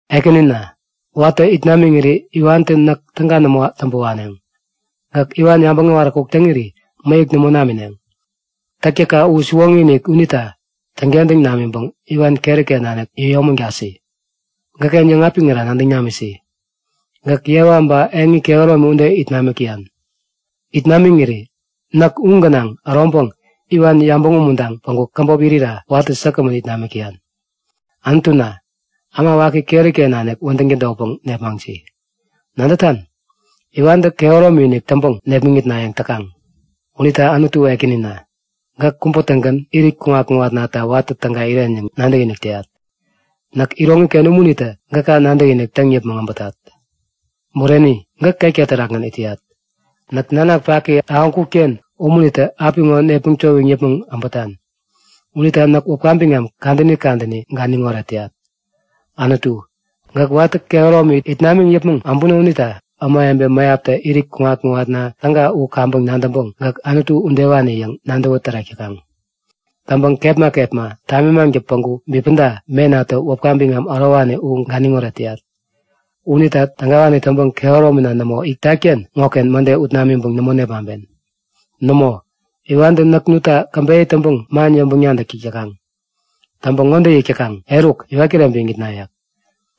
Ekänina, watä it namiŋiri iwantä näk täga nämo täŋpä waneŋ. Gäk iwan yabäŋ äwaräkuk täŋiri mäyäk nämo namineŋ. Täktäkka u siwoŋi-inik unita täŋkentäŋ namiŋpäŋ iwan keriken nanik yäyomägasi! Gäkken yäŋapiŋira nadäŋ namisi. Gäk yewa ba eŋi kehäromi ude it namik täyan. It namiŋiri näk u gänaŋ äroŋpäŋ iwan yabäŋ umuntaŋ päŋku käbop irira watä säkgämän it namik täyan. Anutuna, äma waki keriken nanik wädäŋ tädotpäŋ nepmaŋsi. Nadätan? Iwantä kehäromi-inik täŋpäŋ nepmäŋitnayäŋ täkaŋ. Unita Anutu Ekänina, gäk kubä-tägän irit kuŋat-kuŋatnata watä täga iren yäŋ nadäkinik täyat. Näk iroŋiken umunitä gäka nadäkinik täŋ yäpmäŋ äbätat. Bureni! Gäk ketka terakgän it täyat. Näk nanak paki ahäŋkutken unitä apiŋo nepmäŋ towiŋ yäpmäŋ äbätan. Unita näk wäpka biŋam kadäni kadäni ganiŋoret täyat. Anutu, gäk watä kehäromi it namiŋ yäpmäŋ abuno unita ämawebe mäyaptä irit kuŋat-kuŋatna täga u kaŋpäŋ nadäŋpäŋ gäk Anutu udewani yäŋ nadäwä tärek täŋkuŋ. Täŋpäŋ kepma kepma, tamimaŋtä päŋku bipäda menatä wäpka biŋam ärowani u ganiŋoret täyat. Unita tägawani täŋpäŋ kehäromina nämo itatken ŋoken mäde ut namiŋpäŋ nämo nepmaŋpen. Nämo, iwantä näk nutta käbeyä täŋpäŋ man yäŋpäŋ-nadäk täk täkaŋ. Täŋpäŋ ŋode yäk täkaŋ; Eruk! Iwat kireŋpäŋ iŋitna yäk.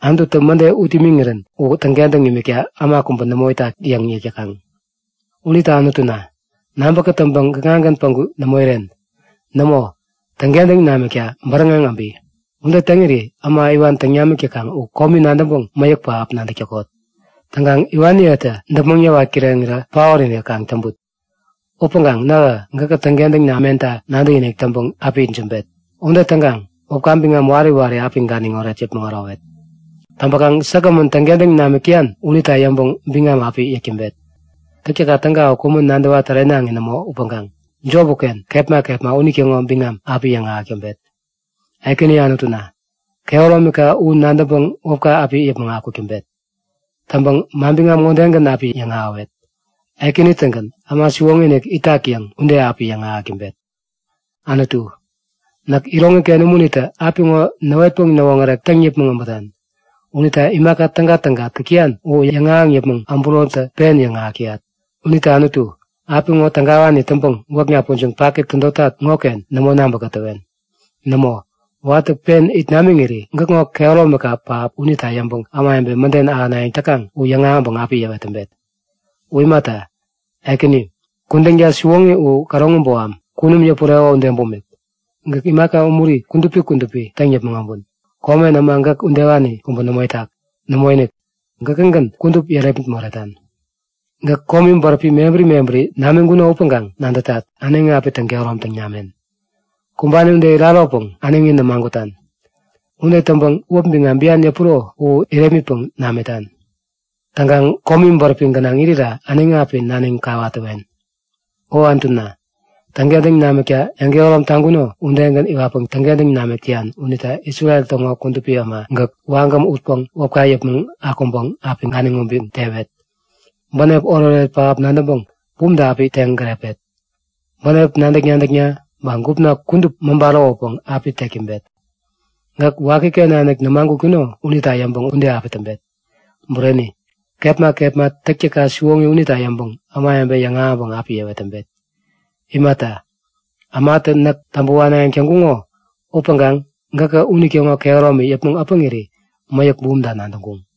Anututä mäde ut imiŋirän u täŋkentäŋ imikta äma kubä nämo itak yäŋ yäk täkaŋ. Unita Anutuna, nabä kätäŋpäŋ gäkŋagän päŋku nämo iren. Nämo, täŋkentäŋ namikta bäräŋeŋ äbi! Ude täŋiri äma iwan täŋ namik täkaŋ u komi nadäŋpäŋ mäyäk pähap nadäk täkot. Täŋkaŋ iwaniyetä däpmäŋ yäwat kireŋirä paot-inik kaŋ täŋput. Upäŋkaŋ nähä gäkä täŋkentäŋ namenta nadäkinik täŋpäŋ api itsämbet. Ude täŋkaŋ wäpka biŋam wari wari api ganiŋoret yäpmäŋ ärowet. Täŋpäŋ säkgämän täŋkentäŋ namik täyan unita yäŋpäŋ biŋam api yäk täŋpet. Täktäkka täga u kumän nadäwa-tärenaŋi nämo upäŋkaŋ, jop uken, kepma kepma unitäŋo biŋam api yäŋahäk täŋpet. Ekäni Anutuna, kehäromika u nadäŋpäŋ wäpka api yäpmäŋ akuk täŋpet. Täŋpäŋ manbiŋam ŋodegän api yäŋahäwet; Ekäni-tägän äma siwoŋi-inik itak yäŋ ude api yäŋahäk täŋpet. Anutu, näk iroŋiken umunitä apiŋo näwetpäŋ näwoŋärek täŋ yäpmäŋ äbätan. Unita imaka tägatäga täk täyan u yäŋahäŋ yäpmäŋ äburotä pen yäŋahäk täyat. Unita Anutu, apiŋo tägawani täŋpäŋ gwäkna pujiŋ paki tädotak ŋoken nämo nabä-kätäwen! Nämo, watä pen it namiŋiri gäkŋo kehäromika pähap unita yäŋpäŋ ämawebe mäden ahänayäŋ täkaŋ u yäŋahäŋpäŋ api yäwet täŋpet. U imata, Ekäni, kudänka siwoŋi u käroŋi boham, kunum yäpureko ude bumik. Gäk imaka umuri kudupi kudupi täŋ yäpmäŋ äbun. Komen äma gäk udewani kubä nämo itak. Nämoinik, gäkägän kudup yärepmit moretan. Gäk komi bäräpi mebäri mebäri namiŋkuno upäŋkaŋ nadätat; Äneŋi api täŋ-kehäromtaŋ namen. Kumbani ude iraropäŋ äneŋi nämagutan. Ude täŋpäŋ wäp biŋam bian yäpuro u irepmitpäŋ namitan. Täŋkaŋ komi bäräpi gänaŋ irira äneŋi api naniŋ kawat täwen. O Anutuna, täŋkentäŋ namikta yäŋkehärom taŋkuno udegän iwatpäŋ täŋkentäŋ namik täyan unita Isrel täŋo kudupi äma gäk wagäm utpäŋ wäpka yäpmäŋ akuŋpäŋ api ganiŋ ubiŋ tewet. Bänep oretoret pähap nadäŋpäŋ bumta api teŋ gärepet. Bänep nadäk-nadäkna ba gupna kudup mäba ärowäpäŋ api tek täŋpet. Gäk wakiken nanik nämagutkuno unita yäŋpäŋ ude api täŋpet. Bureni, kepma kepma täktäkka siwoŋi unita yäŋpäŋ ämawebe yäŋahäŋpäŋ api yäwet täŋpet. Imata, ämatä näk täŋpä wanayäŋ täŋkuŋo upäŋkaŋ gäkä unitäŋo kehäromi yäpmäŋ äpäŋiri mäyäk bumta nadäŋkuŋ.